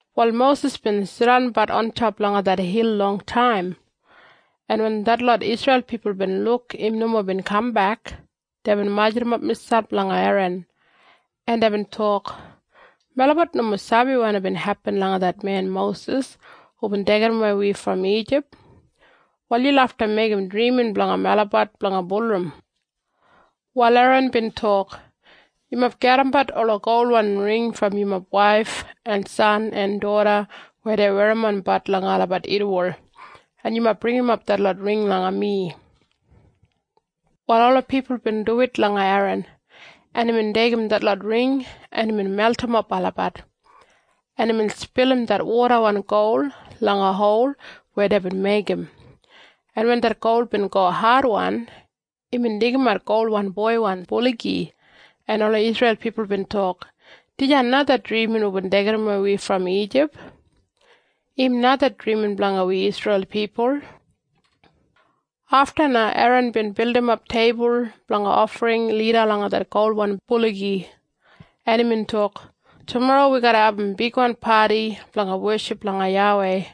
Wal Mosis bin jidanbat ontop langa det hil longtaim, en wen detlot Isreil pipul bin luk im nomo bin kambek, deibin majurrumap miselp langa Eran, en deibin tok, “Melabat nomo sabi wanim bin hepin langa det men Mosis hubin deigidawei wi brom Ijip. Wal yu lafta meigim drimin blanga melabat blanga bulurrum.” Wal Eran bin tok, “Yumob pulumat ola golwan ring brom yumob waif en san en doda weya dei werrimbat langa olabat irriwol, en yumob bringimap detlot ring langa mi.” Wal ola pipul bin duwit langa Eran, en imbin deigim detlot ring, en imbin meltimap olabat, en imbin spilim det wodawan gol langa hol weya deibin meigim, en wen det gol bin go adwan, imbin deigimat golwan boiwan buligi, en ola Isreil pipul bin tok, “Dijan na det drimin hubin deigidawei wi brom Ijip! Im na det drimin blanga wi Isreil pipul!” Afta na Eran bin bildimap teibul blanga ofring lida langa det golwan buligi, en imbin tok, “Tumorro wi garra abum bigwan padi blanga weship langa YAWEI.”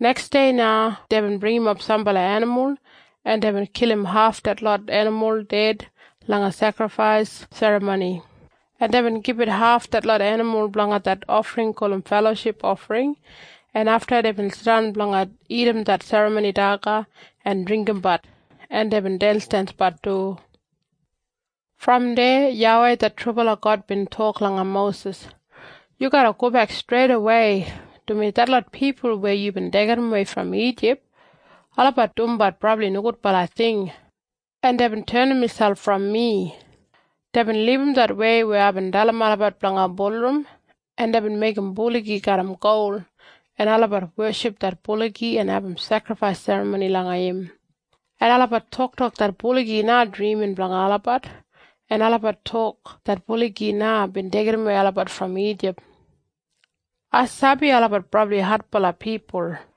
Neksdei na deibin bringimap sambala enimul, en deibin kilim haf detlot enimul ded langa sekrifais serramoni, en deibin gibit haf detlot enimul blanga det ofring gulum feloship ofring, en afta deibin jidan blanga dagat det serramoni daga en dringgimbat, en deibin densdensbat du. Brom deya YAWEI det trubala God bin tok langa Mosis, “Yu garra gobek streidawei, dumaji detlot pipul weya yubin deigidawei brom Ijip, olabat dumbat brabli nogudbala ting, en deibin tenim miselp brom mi. Deibin libum det wei weya aibin dalim olabat blanga bulurrum, en deibin meigim buligi garram gol, en olabat weship det buligi en abum sekrifais serramoni langa im, en olabat toktok det buligi na drimin blanga olabat, en olabat tok det buligi na bin deigidawei olabat brom Ijip. Ai sabi olabat brabli adbala pipul,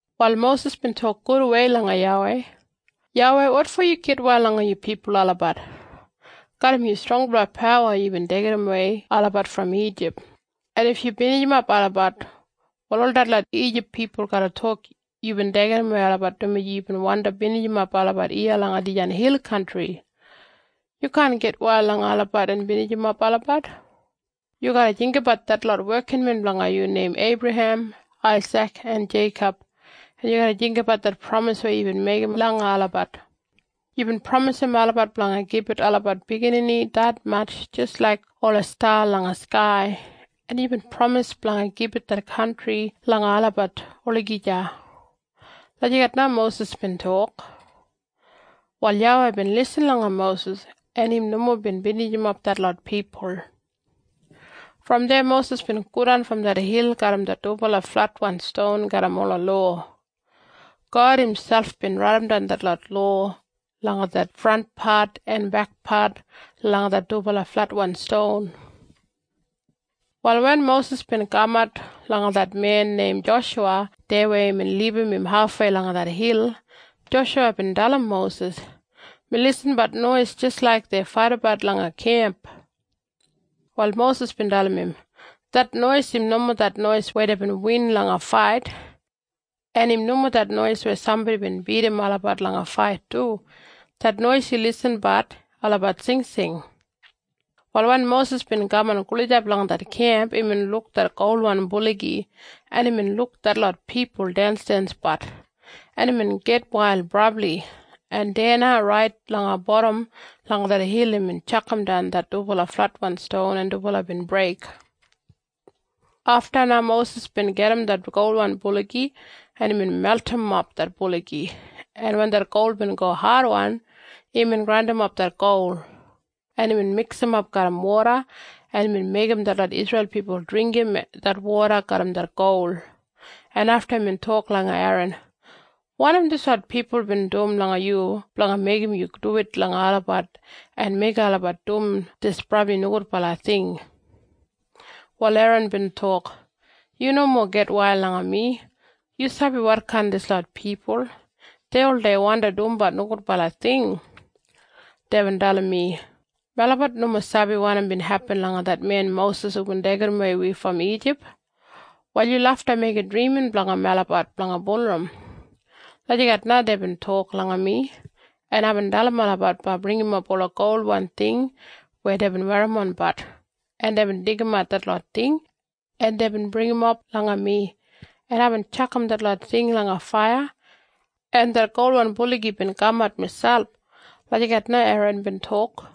Wal Mosis bin tok gudwei langa YAWEI, “YAWEI, wotfo yu gitwail langa yu pipul olabat? Garram yu strongbala pawa yubin deigidawei olabat brom Ijip, en if yu binijimap olabat, wal ol detlot Ijip pipul garra tok yubin deigidawei olabat dumaji yubin wandi binijimap olabat iya langa dijan hil kantri. Yu kaan gitwail langa olabat en binijimap olabat. Yu garra jinggabat detlot wekinmen blanga yu neim Eibrahem, Aisik en Jeikob, en yu garra jinggabat det pramis weya yubin meigim langa olabat. Yubin pramisim olabat blanga gibit olabat biginini detmatj jis laik ola sta langa skai, en yubin pramis blanga gibit det kantri langa olabat olagija.” Lagijat na Mosis bin tok. Wal YAWEI bin lisin langa Mosis, en im nomo bin binijimap detlot pipul. Brom deya Mosis bin godan brom det hil garram det dubala fletwan ston garram ola lowa. God imselp bin raidimdan detlot lowa langa det frantpat en bekpat langa det dubala fletwan ston. Wal wen Mosis bin kamat langa det men neim Joshuwa deya weya imbin libum im hafwei langa det hil, Joshuwa bin dalim Mosis, “Mi irrimbat nois jis laik dei faidabat langa kemp.” Wal Mosis bin dalim im, “Det nois im nomo det nois weya deibin win langa fait, en im nomo det nois weya sambodi bin bidim olabat langa fait du. Det nois yu irrimbat olabat singsing.” Wal wen Mosis bin kaman gulijap langa det kemp, imbin luk det golwan buligi, en imbin luk detlot pipul densdensbat, en imbin gitwail brabli, en deya na rait langa bodam langa det hil imbin tjakamdan det dubala fletwan ston, en dubala bin breik. Afta na Mosis bin gajim det golwan buligi, en imbin meltimap det buligi, en wen det gol bin go adwan, imbin grandimap det gol, en imbin miksimap garram woda, en imbin meigim detlot Isreil pipul dringgim det woda garram det gol, en afta imbin tok langa Eran, “Wanim dislot pipul bin dum langa yu blanga meigim yu duwit langa olabat en meigim olabat dum dis brabli nogudbala ting?” Wal Eran bin tok, “Yu nomo gitwail langa mi. Yu sabi wotkain dislot pipul. Dei oldei wandi dumbat nogudbala ting. Deibin dalim mi, ‘Melabat nomo sabi wanim bin hepin langa det men Mosis hubin deigidawei wi brom Ijip. Wal yu lafta meigim drimin blanga melabat blanga bulurrum.’ Lagijat na deibin tok langa mi, en aibin dalim olabat blanga bringimap ola golwan ting weya deibin werrimbat, en deibin deigimat detlot ting, en deibin bringimap langa mi, en aibin tjakam detlot ting langa faiya, en det golwan buligi bin kamat miselp!” Lagijat na Eran bin tok.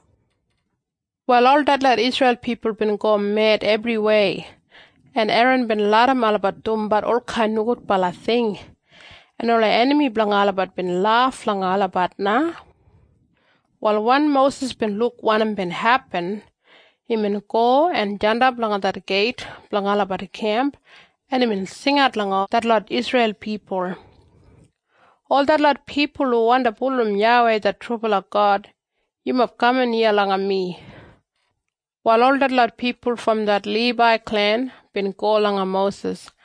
Wal ol detlot Isreil pipul bin go med ebriwei, en Eran bin larram olabat dumbat olkain nogudbala ting, en ola enami blanga olabat bin laf langa olabat na. Wal wen Mosis bin luk wanim bin hepin, imbin go en jandap langa det geit blanga olabat kemp, en imbin jingat langa detlot Isreil pipul, “Ol detlot pipul hu wandi bulurrum YAWEI det trubala God, yumob kaman iya langa mi!” Wal ol detlot pipul brom det Libai klen bin go langa Mosis,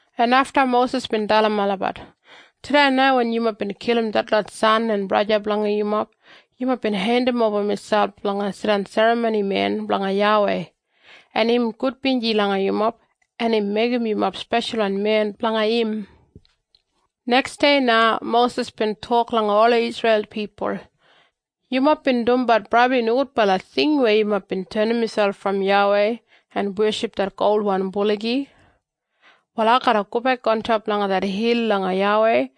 en afta Mosis bin dalim olabat, “Tudei na wen yumob bin kilim detlot san en braja blanga yumob, yumob bin hendimoba miselp blanga jidan serramonimen blanga YAWEI, en im gudbinji langa yumob, en imbin meigim yumob speshalwan men blanga im.” Neksdei na Mosis bin tok langa ola Isreil pipul, “Yumob bin dumbat brabli nogudbala ting weya yumob bin tenim miselp brom YAWEI en weship det golwan buligi. Wal ai garra gobek ontop langa det hil langa YAWEI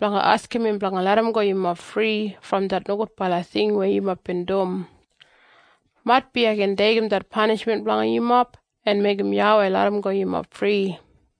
blanga askim im blanga larramgo yumob fri brom det nogudbala ting weya yumob bin dum. Maitbi ai gin deigim det panishmen blanga yumob en meigim YAWEI larramgo yumob fri.”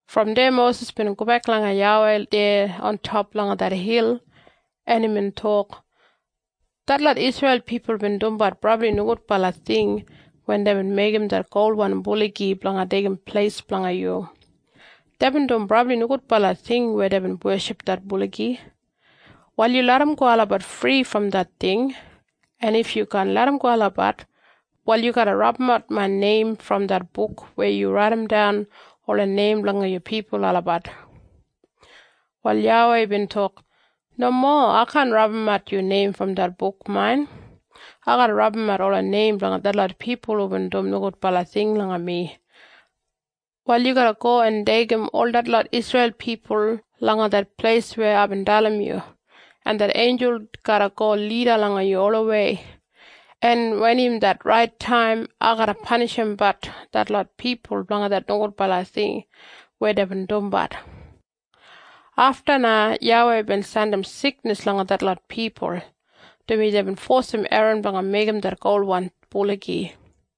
Brom deya Mosis bin gobek langa YAWEI deya ontop langa det hil, en imbin tok, “Detlot Isreil pipul bin dumbat brabli nogudbala ting wen deibin meigim det golwan buligi blanga deigim pleis blanga yu. Deibin dum brabli nogudbala ting weya deibin weship det buligi. Wal yu larramgo olabat fri brom det ting. En if yu kaan larramgo olabat, wal yu garra rabumat main neim brom det buk weya yubin raidimdan ola neim blanga yu pipul olabat.” Wal YAWEI bin tok, “Nomo. Ai kaan rabumat yu neim brom det buk main. Ai garra rabumat ola neim blanga detlot pipul hubin dum nogudbala ting langa mi. Wal yu garra go en deigim ol detlot Isreil pipul langa det pleis weya aibin dalim yu, en det einjul garra go lida langa yu olawei. En wen im det rait taim, ai garra panishimbat detlot pipul blanga det nogudbala ting weya deibin dumbat.” Afta na YAWEI bin jandim siknis langa detlot pipul, dumaji deibin fosim Eran blanga meigim det golwan buligi.